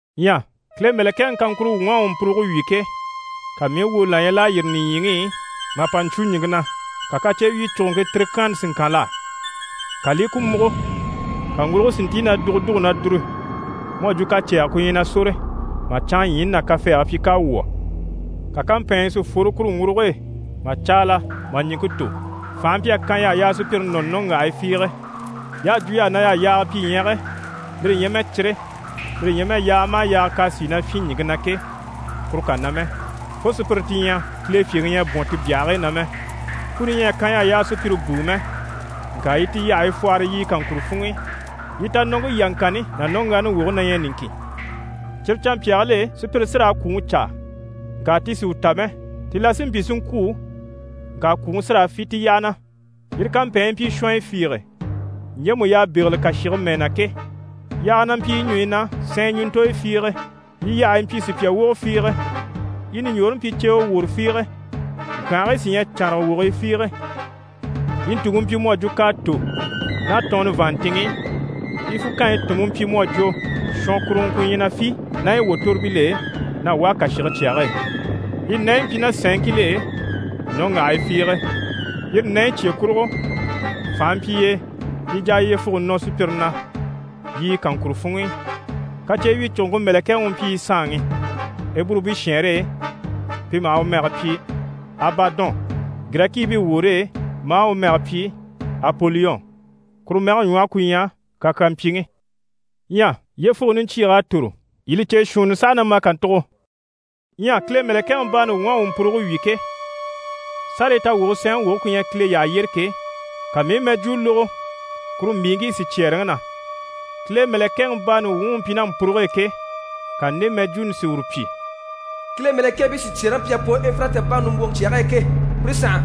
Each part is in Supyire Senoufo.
Ɲyɛ Kile mɛ̀lɛkɛŋi kaŋkuro wuŋ'à u mpuruge wyì ke, ka mii i woni là ɲya l'à yîri nìɲyiŋi i mà mpa ɲcwo ɲìŋke na, ka kacyewyicuguŋke tirikyaanni si ŋkan l'á. Ka li i ku múgo, ka ŋguruge si ntíi na dùgudugu na dùru mu à jwo kacɛɛgɛ ku ɲyɛ na sóre, mà canŋaɲyiini ná kafɛɛge pyi k'à wwɔ̀. Ka kampɛɛnɲyɛ si fworo kuru ŋguruge e mà caala mà ɲìŋke tò. Fànhe mpyi a kan y'a sùpyire nɔni nɔ́ŋgyahigii fiige. Y'à jwo y'á na y'àha yaaga pyi ɲyɛge, lire ɲyɛ mɛ cire, lire ɲyɛ mɛ yaaga maha yaaga k'à sìi na fyîn ɲìŋke na ke, kuru kà na mɛ, fo sùpyire ti ɲyɛ Kile fyèŋi ɲyɛ a bwɔ̀n ti byahigii na mɛ. Kuni ɲyɛ a kan y'á, y'a sùpyire bùu mɛ, ŋka yi ti yyahayi fwɔhɔrɔ yiɲyɛ kaŋkuro funŋ'i. Yi tanɔŋke yaŋkanni ná nɔ́ŋgyaani woge na ɲyɛ niŋkin. Cyire canmpyaagil'e, sùpyire sí raa kwùŋi caa, ŋka ti sì u ta mɛ. Ti la sí n‑pyi si ŋkwû, ŋka kwùŋi sí raa fî ti yyaha na. Yire kampɛɛnɲyi mpyi shɔnyɔ fiige, ɲjemu y'à bégele kàshige mɛɛ na ke. Yaaya na mpyi yi ɲùɲyi na sɛɛn ɲùntoyo fiige, yi yyahayi mpyi sùpya wogo fiige. Yi ɲùɲjoore mpyi ceewe woro fiige, ŋkyànhigii sí ɲyɛ cànraga wogii fiige. Yi ntùŋke mpyi mu à jwo k'à tò ná tɔɔnnɔ vàanntinŋ'i, yi fukanyi tùnmpe mpyi mu à jwo shɔnkuruŋɔ ku ɲyɛ na fî ná yi wòtoribil'e na wá kàshige cyage e. Yi nɛɲyi mpyi ná sɛ̀nŋil'e nɔ́ŋgyahii fiige. Yire nɛɲyi cye kurugo, fànhe mpyi y'e, yi jà a yyefuge nɔ sùpyire na yiɲyɛ kaŋkuro funŋ'i. Kacyewyicuguŋke mɛ̀lɛkɛŋi u mpyi yi saanŋi. Eburubii shɛɛnre e pi maha u mɛge pyi: «Abadɔn» Girɛkiibii woore e maa u mɛge pyi: «Apoliyɔn». (Kuru mɛge ɲwɔhe ku ɲyɛ: «kakyampyiŋi».) Ɲyɛ yyefuge niɲcyiig'à tòro, yii li cè shuunni saha na ma kàntugo. Ɲyɛ Kile mɛ̀lɛkɛŋi baani wuŋ'à u mpuruge wyì ke, sárayi tawwuge sɛɛnŋi woge ku ɲyɛ Kile yyaha yyére ke, ka mii i mɛjwuu lógo kuru mbìiŋkii sicyɛɛreŋi na. Kile mɛ̀lɛkɛŋi baani wuŋi u mpyi ná mpuruge e ke, ka nde mɛjwuuni si uru pyi: «Kile mɛ̀lɛkɛɛbii sicyɛɛreŋi u à pwɔ Efirati baŋi nimbwoŋi cyage e ke, pire sànha.»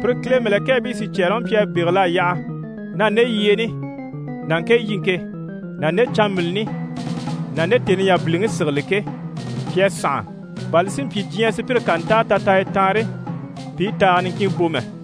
Pire Kile mɛ̀lɛkɛɛbii sicyɛɛreŋi mpyi a bégel'a yaha na nde yyeeni ná ŋke yiŋke ná nde canmbilini ná nde tèni yabiliŋi sigili ke, pi à sànha, bà li si mpyi, diɲyɛ sùpyire ká ntáa tataaya taanre, pi i taaga niŋkin bò mɛ.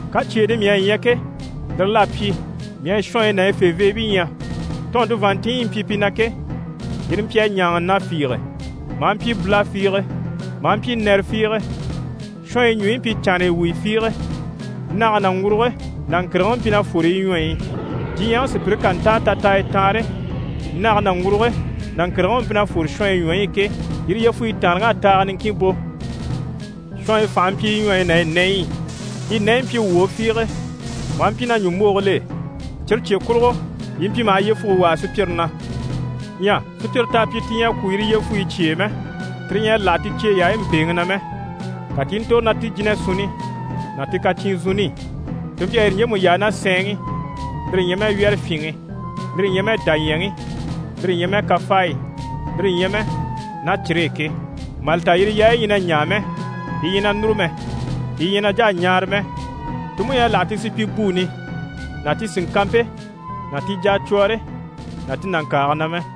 Kacyeeni mii à ɲya ke, lire l'à pyi, mii à shɔnyi ná yi feveebii ɲya. Tɔɔnnte vàanntinɲyi yi mpyi pi na ke, yire mpyi a ɲáaŋa na fiige, maa mpyi bula fiige, maa mpyi nɛrɛ fiige. Shɔnyi ɲùɲyi mpyi canraya wuyi fiige. Nage ná ŋguruge ná ŋkìrigiŋi mpyi na fwore yi ɲwɔyi i. Diɲyɛŋi sùpyire ká ntáa tataaya taanre, nage ná ŋguruge ná ŋkìrigiŋi u mpyi na fwore shɔnyi ɲwɔyi i ke, yire yyefuyi taanreŋ'à taaga niŋkin bò. Shɔnyi fànhe mpyi yi ɲwɔyi ná yi nɛɲyi i. Yi nɛɲyi mpyi wwòo fiige, maa mpyi ná ɲùmbogil'e. Cyire cye kurugo, yi mpyi maha yyefuge wàa sùpyire na. Ɲyɛ sùpyire t'à pyi ti ɲyɛ a kwû yire yyefuyi cye e mɛ, tire ɲyɛ a láha ti cyeyayaayi mpèeŋi na mɛ. Ka ti i ntòro ná ti jínasunni ná ti kacyinzunni i, ti mpyi a yire ɲjemu yaa ná sɛɛnŋi, lire ɲyɛ mɛ wyɛ́rɛfyinŋi, lire ɲyɛ mɛ dàɲyɛŋi, lire ɲyɛ mɛ kafaayi, lire ɲyɛ mɛ ná cire e ke. Mà li ta, yire yaayi ɲyɛ na ɲaa mɛ, yi ɲyɛ na núru mɛ, yi ɲyɛ na jà a ɲaara mɛ. Ti mú ɲyɛ a láha ti supyibuuni ná ti sìŋkanmpe ná ti jacwɔɔre ná ti nàŋkaage na mɛ.